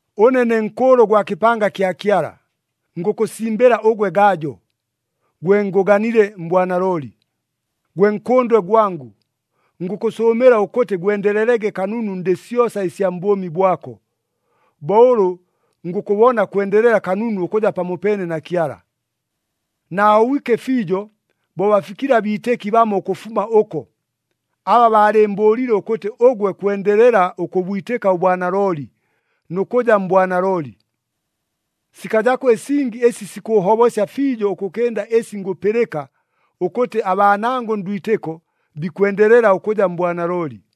Ʉne ne nkʉʉlʉ gwa kɨpanga kya Kyala, ngʉkʉsimbɨla ʉgwe Gajo, gwe ngʉganile mbwanalooli. Gwe nkʉndwe gwangʉ, ngʉkʉsʉʉmɨla ʉkʉtɨ gwendelelege kanunu ndɨ syosa ɨsya mbʉʉmi bwako, bo ʉlʉ ngʉkʉbona kwendelela kanunu ʉkʉja pamopeene na Kyala. Naahobwike fiijo bo bafikile abiitɨki bamo ʉkʉfuma ʉko, aba baalɨɨmbʉʉlile ʉkʉtɨ ʉgwe kwendelela ʉkʉbwitɨka ʉbwanalooli, nʉ kʉja mbwanalooli. Sikajako ɨsingi ɨsi sikʉʉhobosya fiijo ʉkʉkɨnda ɨsi ngʉpɨlɨka ʉkʉtɨ abaanangʉ ndwitɨko bikwendelela ʉkʉja mbwanalooli.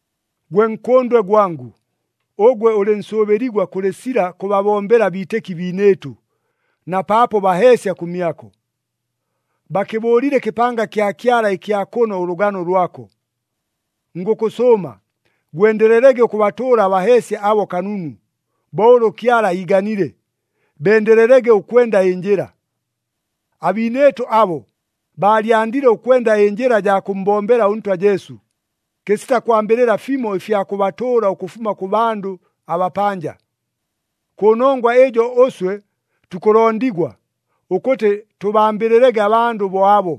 Gwe nkʉndwe gwangʉ, ʉgwe ʉlɨ nsʉʉbɨligwa kʉlɨ sila kʉbabombela abiitɨki biinɨɨtʉ, na paapo baheesya kʉmyako. Bakɨbʉʉlile ɨkɨpanga kya Kyala ɨkya kʉno ʉlʉgano lwako. Ngʉkʉsʉʉma, gwendelelege ʉkʉbatʉʉla abaheesya abo kanunu, bo ʉlʉ Kyala iiganile, bendelelege ʉkwenda ɨnjɨla. Abiinɨɨtʉ abo, baalyandile ʉkwenda ɨnjɨla jaa kʉmmbombela ʉNtwa Jesu, kɨsita kwambɨlɨla fimo ɨfya kʉbatʉʉla ʉkʉfuma kʉ bandʉ abapanja. Kʉnongwa ɨjo ʉswe tukʉlondigwa ʉkʉtɨ tʉbambɨlɨlege abandʉ bo abo,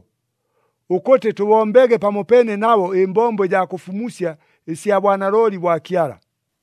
ʉkʉtɨ tʉbombege pamopeene nabo ɨmbombo ɨjaa kʉfumusya ɨsya bwanalooli bwa Kyala.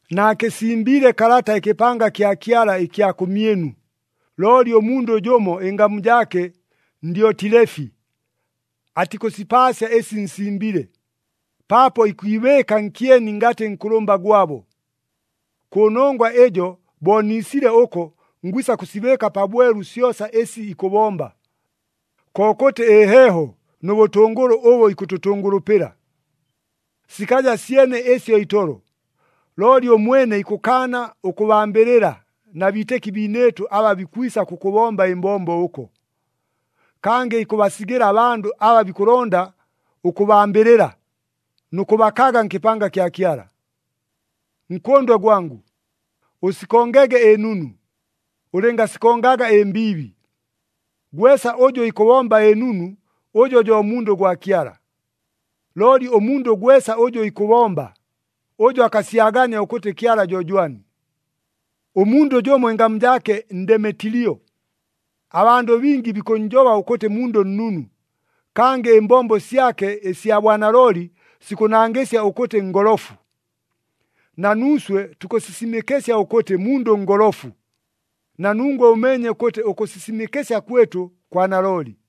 Naakɨsimbiile kalata ɨkɨpanga kya Kyala ɨkya kʉmyɨnu, looli ʉmundʉ jʉmo ɨngamu jaake Ndyotilefi atikʉsipaasya ɨsi nsimbile, paapo ikwibɨɨka nkyeni ngatɨ nkʉlʉmba gwabo. Kʉnongwa ɨjo bo niisile ʉko ngwisa kʉsibɨɨka pabwelu syosa ɨsi ikʉbomba, kokʉtɨ ɨheeho nʉ bʉtʉngʉlʉ ʉbʉ ikʉtʉtʉngʉlʉpɨla. Sikaja syene ɨsyo itolo, looli ʉmwene ikʉkaana ʉkʉbambɨlɨla na biitɨki biinɨɨtʉ aba bikwisa kʉkʉbomba ɨmbombo ʉko. Kangɨ ikʉbasigɨla abandʉ aba bikʉlonda ʉkʉbambɨlɨla, nʉ kʉbakaga nkɨpanga kya Kyala. Nkʉndwe gwangʉ, ʉsikongege ɨnunu, ʉlɨngasikongaga ɨmbiibi. Gwesa ʉjʉ ikʉbomba ɨnunu, ʉjo jo mundʉ gwa Kyala. Looli ʉmundʉ gwesa ʉjʉ ikʉbomba, ʉjo akasyagania ʉkʉtɨ Kyala jo jwani. Ʉmundʉ jʉmo ɨngamu jaake Ndemetilio, abandʉ bingi bikʉnnjoba ʉkʉtɨ mundʉ nnunu, kangɨ ɨmbombo syake ɨsya bwanalooli sikʉnangɨsya ʉkʉtɨ ngolofu. Na nuuswe tukʉsisimɨkɨsya ʉkʉtɨ mundʉ ngolofu, na nungwe ʉmeenye ʉkʉtɨ ʉkʉsisimɨkɨsya kwɨtʉ kwa nalooli.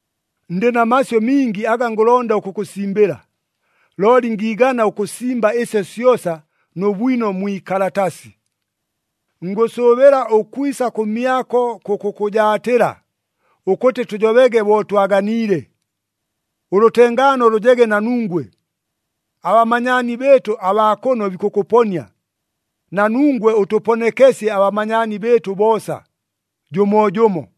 Ndɨ na masyʉ mingi aga ngʉlonda ʉkʉkʉsimbɨla, looli ngiigana ʉkʉsimba ɨsyo syosa nʉ bwino mwi ikalatasi. Ngʉsʉʉbɨla ʉkwisa kʉmyako kʉkʉkʉjaatɨla ʉkʉtɨ tʉjobege bo twaganiile. Ʉlʉtengaano lʉjege na nungwe. Abamanyaani bɨɨtʉ abaa kʉno bikʉkʉponia. Na nungwe ʉtʉponekesye abamanyaani bɨɨtʉ boosa, jʉmoojʉmo.